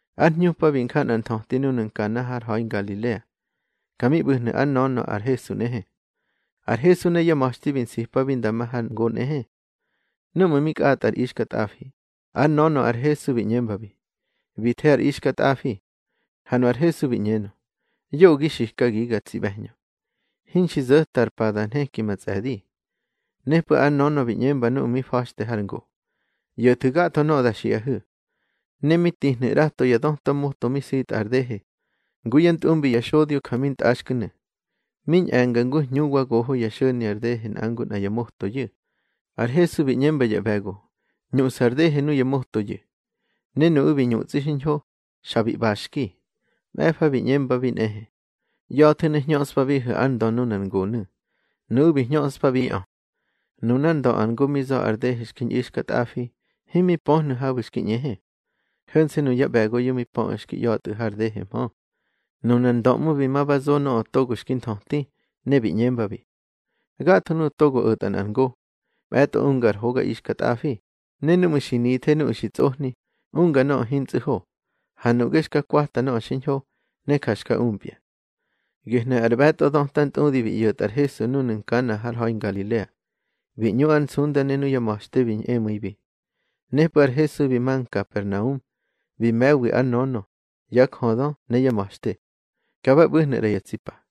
Ár hñupa bi nja nꞌar nthöti núnu̱ Nkana har ha̱i Ngalilea. Ka mi ꞌbu̱hnu̱ ár nönö ar Hesu nꞌehe. Ar Hesu ne yá ma̱xte bi nsipabi nda ma har ngo nꞌehe. Núꞌmu̱ mi kꞌatꞌa ar ixkatꞌafi, ár nönö ar Hesu bi ꞌñembabi: —Bi the ar ixkatꞌafi. Ha nu ar Hesu bi ꞌñenö: —Yoꞌö gi xikagiga, tsi ꞌbe̱hñö. Hinxi zo̱ta ar pa da nheki ma tsꞌe̱di. Nepꞌu̱ ár nönö bi ꞌñemba nuꞌu̱ mi fa̱xte har ngo: —ꞌYo̱thu̱ gatho nöꞌö da xiꞌahu̱. Ne mi tihnu̱ ꞌrato ya döta moto mi sitꞌa ar dehe, ngu yá ntꞌumbi ya xodyo ja mi ntꞌaxku̱nu̱. Mi ñꞌe̱nga ngu hñu wa goho xo̱ni ar dehe nꞌa ngu nꞌa ya motoyu̱. Ar Hesu bi ꞌñemba ya ꞌbe̱go: —Ñuꞌsu̱ ar dehe nuya motoyu̱. Ne nuꞌu̱ bi ñutsꞌi xiñho, xa bi ꞌbaxki. Mꞌe̱fa bi ꞌñembabi nꞌehe: —ꞌYa̱thu̱ ne hñöꞌspabihu̱ ár ndö nunar ngonu̱. Nuꞌu̱ bi hñöꞌspabiꞌö. Nunár ndö ar ngo mi za̱ ar dehe xki ñꞌixkatꞌafi, himi pöhnu̱ habu̱ xki ꞌñehe. Ho̱nse̱ nuya ꞌbe̱goyu̱ mi pöꞌu̱ xki ꞌya̱tꞌu̱ har dehehmö. Nunar ndö ꞌmu̱ bi ma ba zo nöꞌö togo xki nthöti. Ne bi ꞌñembabi: —Gatho nuꞌu̱ togo o̱tꞌa nꞌar ngo, mꞌe̱tꞌo unga ar hoga ixkatꞌafi, ne núꞌmu̱ xi nithe nuꞌu̱ xi tsꞌohni, unga nöꞌö hintsꞌu̱ ho. Ha nuꞌge xka kwata nöꞌö xiñho, ne ja xka umpya. Gehnu̱ ar ꞌbe̱tꞌo dötantꞌudi bi ꞌyo̱tꞌa ar Hesu núnu̱ Nkana har ha̱i Ngalilea. Bi ñꞌu ár nsunda ne nuyá ma̱xte bi ñꞌemu̱ibi. Nepꞌu̱ ar Hesu bi ma Nkapernaum, bi me̱wi ár nönö, yá jödö ne yá ma̱xte. Ka ba ꞌbu̱hnu̱ ꞌra ya tsi pa.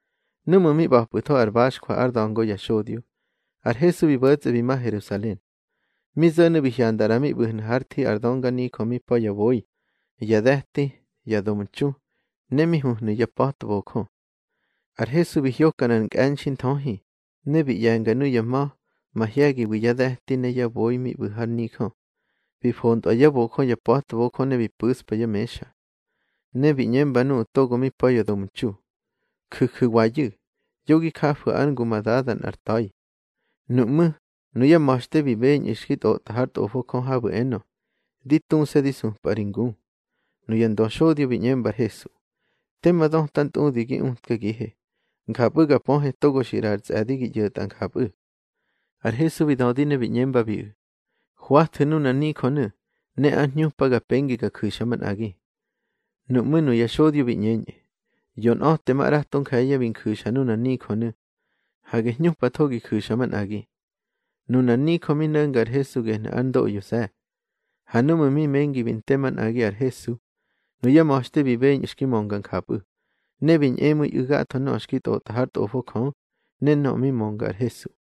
Núꞌmu̱ mi ꞌba̱pꞌu̱tho ar baxjwa ár da̱ngo ya xodyo, ar Hesu bi bo̱tsꞌe bi ma Herusalen. Mi zo̱nu̱ bi hyanda ꞌra mi ꞌbu̱hnu̱ hár thi ar dönganijö mi pa̱ ya boi, ya de̱ti, ya domtxu, ne mi huhnu̱ ya pa̱tbojö. Ar Hesu bi hyoka nꞌar nkꞌe̱nxi nthöhi, ne bi ꞌye̱nga nuya ma̱, mahye̱giwi yá de̱ti ne yá boi mi ꞌbu̱ har nijö. Bi fontꞌwa yá bojö ya pa̱tbojö ne bi pu̱spa yá mexa. Ne bi ꞌñemba nuꞌu̱ togo mi pa̱ ya domtxu: —Juju̱wayu̱, yo gi jafu̱ ár ngu ma Dada nꞌar ta̱i. Nuꞌmú̱, nuyá ma̱xte bi beñꞌu̱ xki tꞌotꞌa hár Tꞌofo Jö habu̱ enö: Di tuse̱ di supꞌa ri ngu. Nuya ndöxodyo bi ꞌñemba ar Hesu: —Tema dötantꞌudi gi utkagihe, njapꞌu̱ ga pöhe togo xi ꞌraꞌa ar tsꞌe̱di gi ꞌyo̱tꞌa njapꞌu̱. Ar Hesu bi dödi ne bi ꞌñembabiꞌu̱: —Hwathu̱ nunar nijönu̱, ne ár hñupa ga pengi ga ju̱xa manꞌagi. Nuꞌmú̱ nuya xodyo bi ꞌñeñꞌu̱: —Yonꞌa̱temaꞌrato nje̱ye̱ bi nju̱xa nunar nijönu̱. Hage hñupatho gi ju̱xa manꞌagi. Nunar nijö mi no̱nga ar Hesu gehnu̱ ár ndoꞌyose̱. Ha núꞌmu̱ mi mengi bi nte manꞌagi ar Hesu, nuyá ma̱xte bi beñꞌu̱ xki mönga njapꞌu̱, ne bi ñꞌemu̱iꞌu̱ gatho nöꞌö xki tꞌotꞌa hár Tꞌofo Jö, ne nöꞌö mi mönga ar Hesu.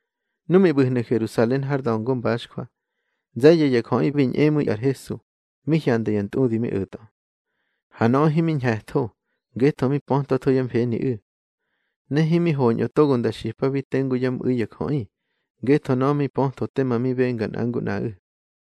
Nu mi ꞌbu̱hnu̱ Herusalen har da̱ngo mbaxjwa, nze̱ye̱ ya jöꞌi bi ñꞌemu̱i ar Hesu, mi hyanda ya ntꞌudi mi o̱tꞌö. Ha nöꞌö himi ñhe̱tho, ngetho mi pötwatho yá mfeniꞌu̱. Ne himi hoñꞌö togo nda xipabi tengu yá mꞌu̱i ya jöꞌi, ngetho nöꞌö mi pötho tema mi benga nꞌa ngu nꞌaꞌu̱.